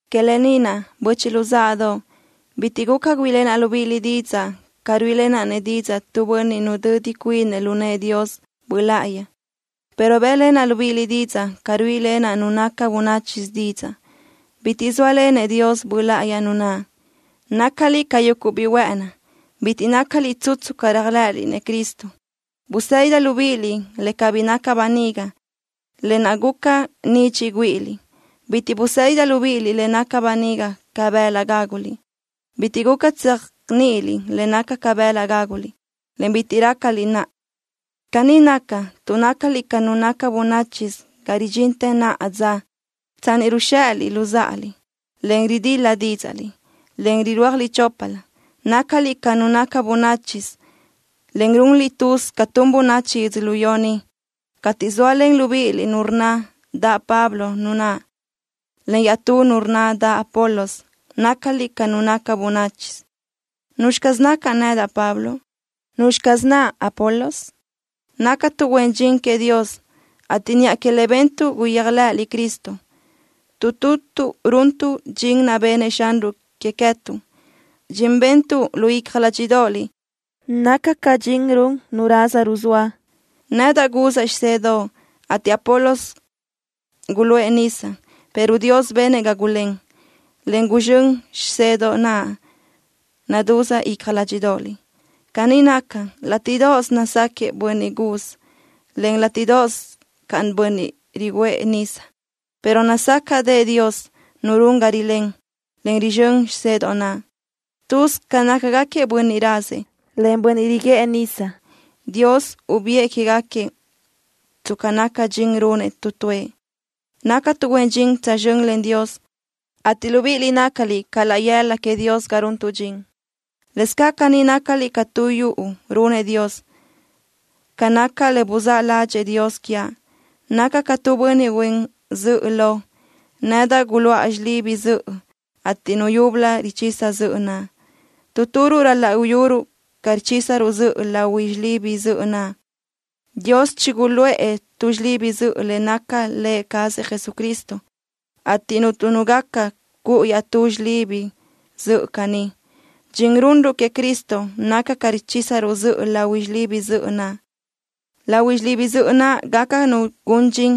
Que lë ni naʼ, böchiʼ luzáʼadoʼ, bitiʼ guca güíʼilenaʼ libíʼiliʼ didzaʼ ca ruíʼilenaʼ-nëʼ didzaʼ tu bönniʼ nudödi cuinëʼ lu nëʼë Dios Böʼ Láʼayi, pero bë́ʼlenaʼ libíʼiliʼ didzaʼ ca ruíʼilenaʼ nu naca bönáchisö didzaʼ, bitiʼ zóalenëʼ Dios Böʼ Láʼayi nu naʼ. Nácaliʼ ca yuguʼ biʼi huë́ʼëni. Bitiʼ nácaliʼ tsutsu ca réajlëʼëliʼ-nëʼ Cristo. Busédidaʼ libíʼiliʼ le cabí naca böniga, lë naʼ guca ca nidxiʼ güíʼiliʼ. Bitiʼ busédidaʼ libíʼiliʼ le naca böniga ca bëlaʼ gáguliʼ. Bitiʼ guca tséajniʼiliʼ le naca ca bëlaʼ gáguliʼ, en bitiʼ rácaliʼ naʼa. Caní naca, tuʼ nácaliʼ ca nu naca bönáchisö ga ridxintë naʼa dza. Tsanni ni ruzxéʼeliʼ luzáʼaliʼ, en ridil-la dídzaʼliʼ, en rirúajliʼ choplö, nácaliʼ ca nu naca bönáchisö, en runliʼ tuz ca tun bönachi yödzölió ni. Cateʼ zóalen libíʼiliʼ nu rnna daʼ Pablo nu naʼ, en iaʼtú nu rnna daʼ Apolos, nácaliʼ ca nu naca bönáchisö. ¿Nuzxi caz nacaʼ nedaʼ, Pablo? ¿Nuzxi caz naʼ Apolos? Nácatuʼ huen dxin queëʼ Dios, ateʼ niʼa que le bentuʼ guyéajlëʼëliʼ Cristo. Tu tutuʼ runtuʼ dxin naʼ bennëʼ Xanruʼ que queë́tuʼ. Dxin bentuʼ lu icja ládxiʼdoʼoliʼ naca ca dxin run nu raza ruzóa. Nedaʼ guzaʼ xisedoʼ, ateʼ Apolos guluʼë nisa, pero Dios benëʼ ga gulén, en guzxö́n xisedoʼ naʼ nadúz icja ládxiʼdoʼoliʼ. Caní naca, látiʼdoʼos nazáquiëʼ bönniʼ guz, en látiʼdoʼos caʼ bönniʼ riguʼë nisa, pero nazácaʼdëʼë Dios Nu run ga rilén, en rizxö́n xisedoʼ naʼ. Tuz ca nácagaquiëʼ bönniʼ razëʼ, en bönniʼ riguʼë nisa. Dios ubiʼë que queë́gaquiëʼ tsca naca dxin runëʼ tu tuëʼ. Nácatuʼ huen dxin tsözxö́n len Dios, ateʼ libíʼiliʼ nácaliʼ ca laʼ yëla queëʼ Dios ga runtuʼ dxin. Lëscaʼ caní nácaliʼ ca tu yuʼu runëʼ Dios. Ca naca le buzáʼ ládxëʼë Dios quiaʼ, nacaʼ ca tu bönniʼ huen zöʼö lo. Nedaʼ guluʼa xilibi zöʼö, ateʼ nu yúbölö richisa zöʼö naʼ. Tu turuʼ ral-laʼ uyuruʼ ca richísaruʼ zöʼö lahui xilibi zöʼö naʼ. Dios chiguluʼë tu xilibi zöʼö le naca Lë cazëʼ Jesucristo, ateʼ cuntu nu gaca cuʼu iaʼtú xilibi zöʼö caní. Dxin runruʼ queëʼ Cristo naca ca richísaruʼ zöʼö lahui xilibi zöʼö naʼ. Lahui xilibi zöʼö naʼ gaca nu gun dxin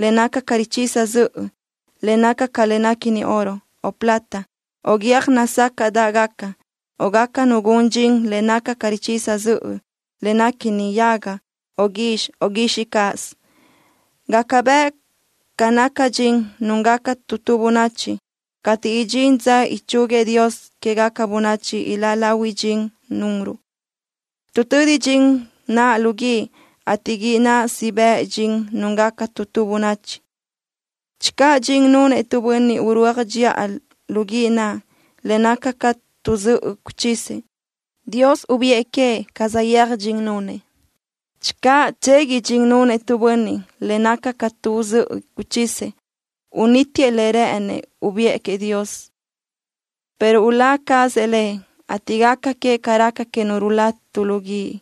le naca ca richisa zöʼö le naca ca le néquini oro, o plata, o guiö́j nazácaʼdaʼgaca, o gaca nu gun dxin le naca ca richisa zöʼö le néquini yaga, o guizxi, o guixiʼ cáʼasö. Gaca bëʼ ca naca dxin núngaca tu tu bönachi. Cateʼ idxín dza ichúguiëʼ Dios quégaca bönachi, iláʼ lahui dxin nunruʼ, tuʼ tödi dxin naʼ lu guíʼ, ateʼ guíʼ naʼ siʼ bëʼ dxin núngaca tu tu bönachi. Channö dxin nunëʼ tu bönniʼ urúaj dxiʼa lu guíʼ naʼ, le naca ca tu zöʼö guchisëʼ, Dios ubiʼë queëʼ ca saʼyéaj dxin nunëʼ. Channö tsegui dxin nunëʼ tu bönniʼ le naca ca tu zöʼö guchisëʼ, unítiëʼ le rë́ʼënëʼ ubiʼë Dios queëʼ, pero ulá cazëʼ lëʼ, ateʼ gaca queëʼ ca raca que nu rulá tu lu guíʼ.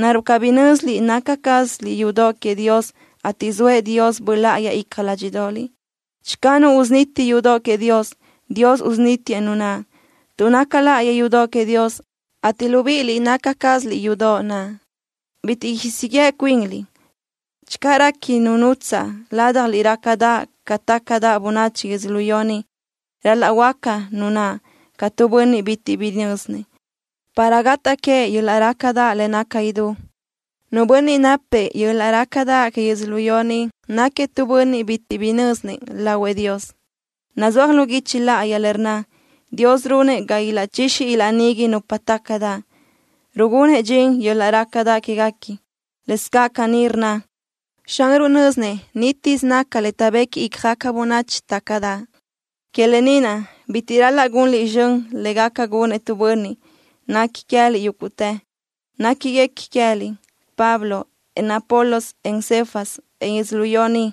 ¿Naruʼ cabí nö́ziliʼ naca cázaliʼ yudoʼ queëʼ Dios, ateʼ zoëʼ Dios Böʼ Láʼayi icja ládxiʼdoʼoliʼ? Channö nu usuniti yudoʼ queëʼ Dios, Dios usunítiëʼ nu naʼ, tuʼ naca láʼayi yudoʼ queëʼ Dios, ateʼ libíʼiliʼ naca cázaliʼ yudoʼ naʼ. Bitiʼ siʼ yeʼe cuinliʼ. Channö réqui nu nutsaʼ ládjaliʼ rácadaʼ ca tácadaʼ bönachi yödzölió ni, ral-laʼ huöáca nu naʼ ca tu bönniʼ bitiʼ bi nö́zinëʼ, para gataʼ que yöl-laʼ rácadaʼ le naca idú. Nu bönniʼ napzëʼ yöl-laʼ rácadaʼ que yödzölió ni náquiëʼ tu bönniʼ bitiʼ bi nö́zinëʼ lahuëʼ Dios. Nazúaj lu guichi láʼayi le rnna: “Dios runëʼ ga ilaʼchixi ilaʼnigui nupa tácadaʼ, rugunëʼ dxin yöl-laʼ rácadaʼ quéguequi.” Lëscaʼ caní rnna: “Xanruʼ nö́zinëʼ nítisö naca le taʼbequi ícjagaca bönachi tácadaʼ.” Que lë ni naʼ, bitiʼ ral-laʼ gunliʼ zxön le gaca gunëʼ tu bönniʼ. Nequi queë́liʼ yúguʼtë. Néquiguequi queë́liʼ: Pablo, en Apolos, en Cefas, en yödzölió ni,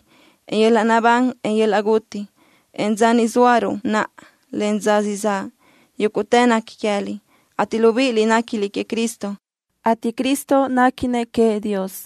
en yöl-laʼ naʼbán, en yöl-laʼ guti, en dza ni zóaruʼ naʼa, en dza siʼ zaʼ. Yúguʼtë nequi queë́liʼ, ateʼ libíʼiliʼ néquiliʼ queëʼ Cristo, ateʼ Cristo néquinëʼ queëʼ Dios.